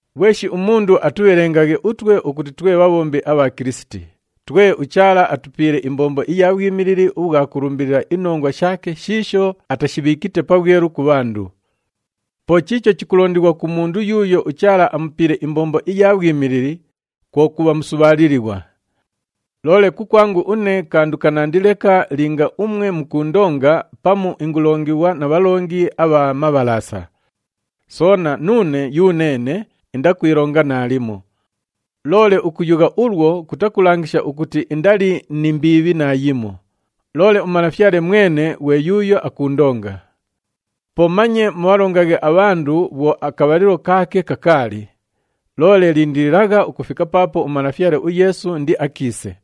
Ghweshi umundu atubhelengaghe utwe ukuti twe bhabhombi abha Kilisiti, twe uChaala atupiile imbombo iya bhwimilili ubhwa kulumbilila inongwa shaake shiisho atashibhiikite pabhwelu ku bhandu. Po chiicho chikulondighwa ku mundu yuuyo uChaala amupiile imbombo iya bhwimilili, kwo kubha musubhaalilighwa. Loole kukwangu une kandu kanandi leka linga umwe mukuundonga pamu ingulongighwa na bhalongi abha mabhalaasa. Soona, nuune yuneene indakwilonga naalimo. Loole ukuyugha ulwo kutakulangisha ukuti indali ni mbiibhi naayimo, loole uMalafyale mwene ghwe yuuyo akuundonga. Po manye mubhalongaghe abhandu bhwo akabhalilo kaake kakaali, loole lindililagha ukufika paapo uMalafyale uYeesu indiakiise.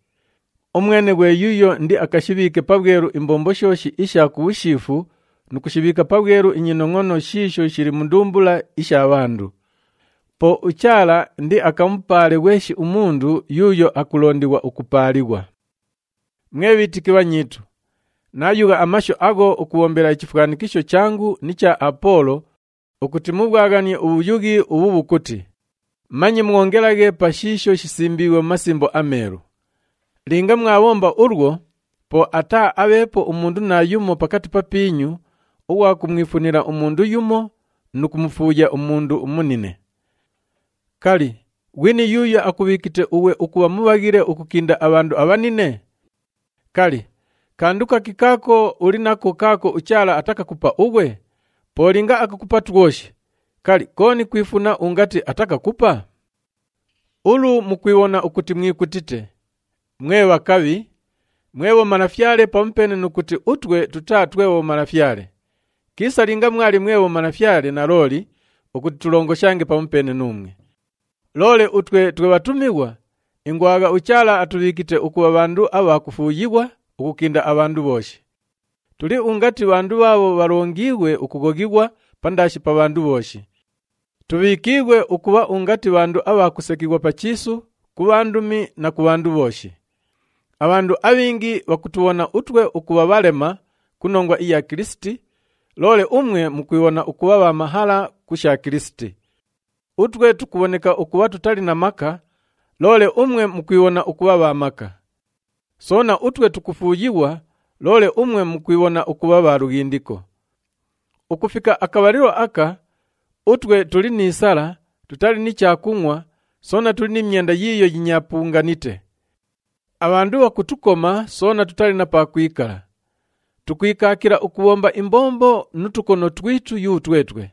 Umwene ghwe yuuyo indiakashibhiike pabhwelu imbombo shooshi isha ku bhushiifu nu kushibhiika pabhwelu inyinongʼono shiisho shili mu ndumbula isha bhandu. Po uChaala indiakamupaale ghweshi umundu yuuyo akulondighwa ukupaalighwa. Mwe bhiitiki bhanyiitu, naayugha amashu agho ukubhombela ichifwanikisho changu ni cha Apoolo ukuti mubhwaghanie ubhuyughi ubhu bhukuti, “Manye mwongelaghe pa shiisho shisimbiighwe mu Masimbo aMeelu.” Linga mwabhomba ulwo, po ataaabheepo umundu naayumo pakati papiinyu ughwa kumwifunila umundu yumo nu kumufuuya umundu umunine. Kali, ghwini yuuyo akubhiikite ughwe ukubha mubhaghile ukukinda abhandu abhanine? Kali, kandu kaki kaako uli nako kaako uChaala atakakupa ughwe? Po linga akakupa twoshi, kali, kooni kwifuna ungati atakakupa? Ulu mukwibhona ukuti mwikutite! Mwe bhakabhi! Mwe bhomalafyale pamupeene nu kuti utwe tutaa twe bhomalafyale! Kiisa linga mwali mwe bhomalafyale nalooli ukuti tulongoshange pamupeene nuumwe! Loole utwe twe bhatumighwa, ingwagha uChaala atubhiikite ukubha bhandu abha kufuuyighwa ukukinda abhandu bhooshi. Tuli ungati bhandu bhaabho bhalongiighwe ukughoghighwa pandaashi pa bhandu bhooshi. Tubhiikiighwe ukubha ungati bhandu abha kusekighwa pa chiisu, ku bhandumi na ku bhandu bhooshi. Abhandu abhingi bhakutubhona utwe ukubha bhalema ku nongwa iya Kilisiti, loole umwe mukwibhona ukubha bha mahala ku sha Kilisiti! Utwe tukubhoneka ukubha tutali na maka, loole umwe mukwibhona ukubha bha maka! Soona, utwe tukufuuyighwa, loole umwe mukwibhona ukubha bha lughindiko! Ukufika akabhalilo aka, utwe tuli ni sala, tutali ni chakungʼwa soona tuli ni myenda yiiyo yinyaapunganite. Abhandu bhakutukoma soona tutali na pa kwikala. Tukwikaakila ukubhomba imbombo nu tukono twitu yutwetwe.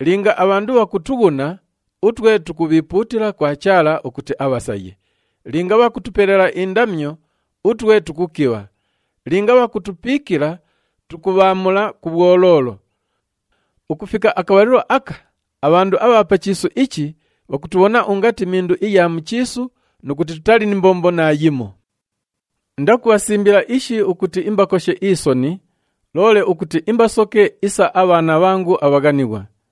Linga abhandu bhakutughuna, utwe tukubhiipuutila kwa Chaala ukuti abhasaye, linga bhakutupelela indamyo, utwe tukukibha, linga bhakutupiikila, tukubhaamula ku bhwoloolo. Ukufika akabhalilo aka, abhandu abha pa chiisu ichi bhakutubhona ungati mindu iya mu chiisu nu kuti tutali ni mbombo naayimo. Indakubhasimbila ishi ukuti imbakoshe isoni, loole ukuti imbasoke isa abhaana bhangu abhaghanighwa.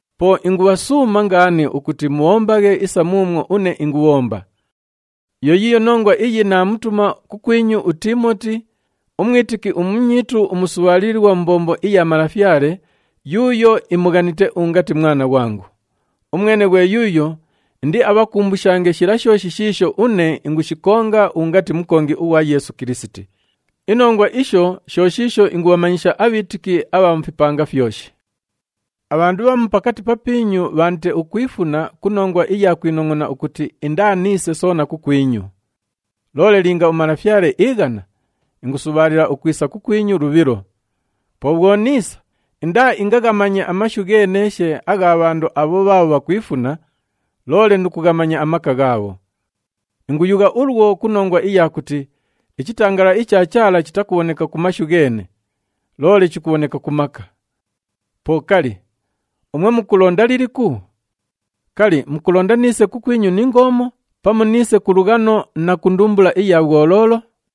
Po ingubhasuuma ngaani ukuti mubhombaghe isa muumwo une ingubhomba. Yo yiiyo nongwa iyi naamutuma kukwinyu uTiimoti, umwitiki umunyiitu umusubhaalilighwa mu mbombo iya Malafyale yuuyo imughanite ungati mwana ghwangu. Umwene ghwe yuuyo indiabhakumbushange shila shooshi shiisho une ingushikonga ungati mukongi ughwa Yeesu Kilisiti. Inongwa isho sho shiisho ingubhamanyisha abhiitiki abha mu fipanga fyoshi. Abhandu bhamu pakati papiinyu bhaandite ukwifuna ku nongwa iya kwinongʼona ukuti indaaniise soona kukwinyu. Loole linga uMalafyale iighana, ingusubhaalila ukwisa kukwinyu lubhilo. Po bhwo niisa, indaaingaghamanye amashu gheeneeshe agha bhandu abho bhaabho bhakwifuna, loole nu kughamanya amaka ghaabho. Inguyugha ulwo ku nongwa iya kuti ichitangalala icha Chaala chitakubhoneka ku mashu gheene, loole chikubhoneka ku maka. Po kali, umwe mukulonda liliku? Kali, mukulonda niise kukwinyu ni ngoomo, pamu niise ku lughano na ku ndumbula iya bhwoloolo?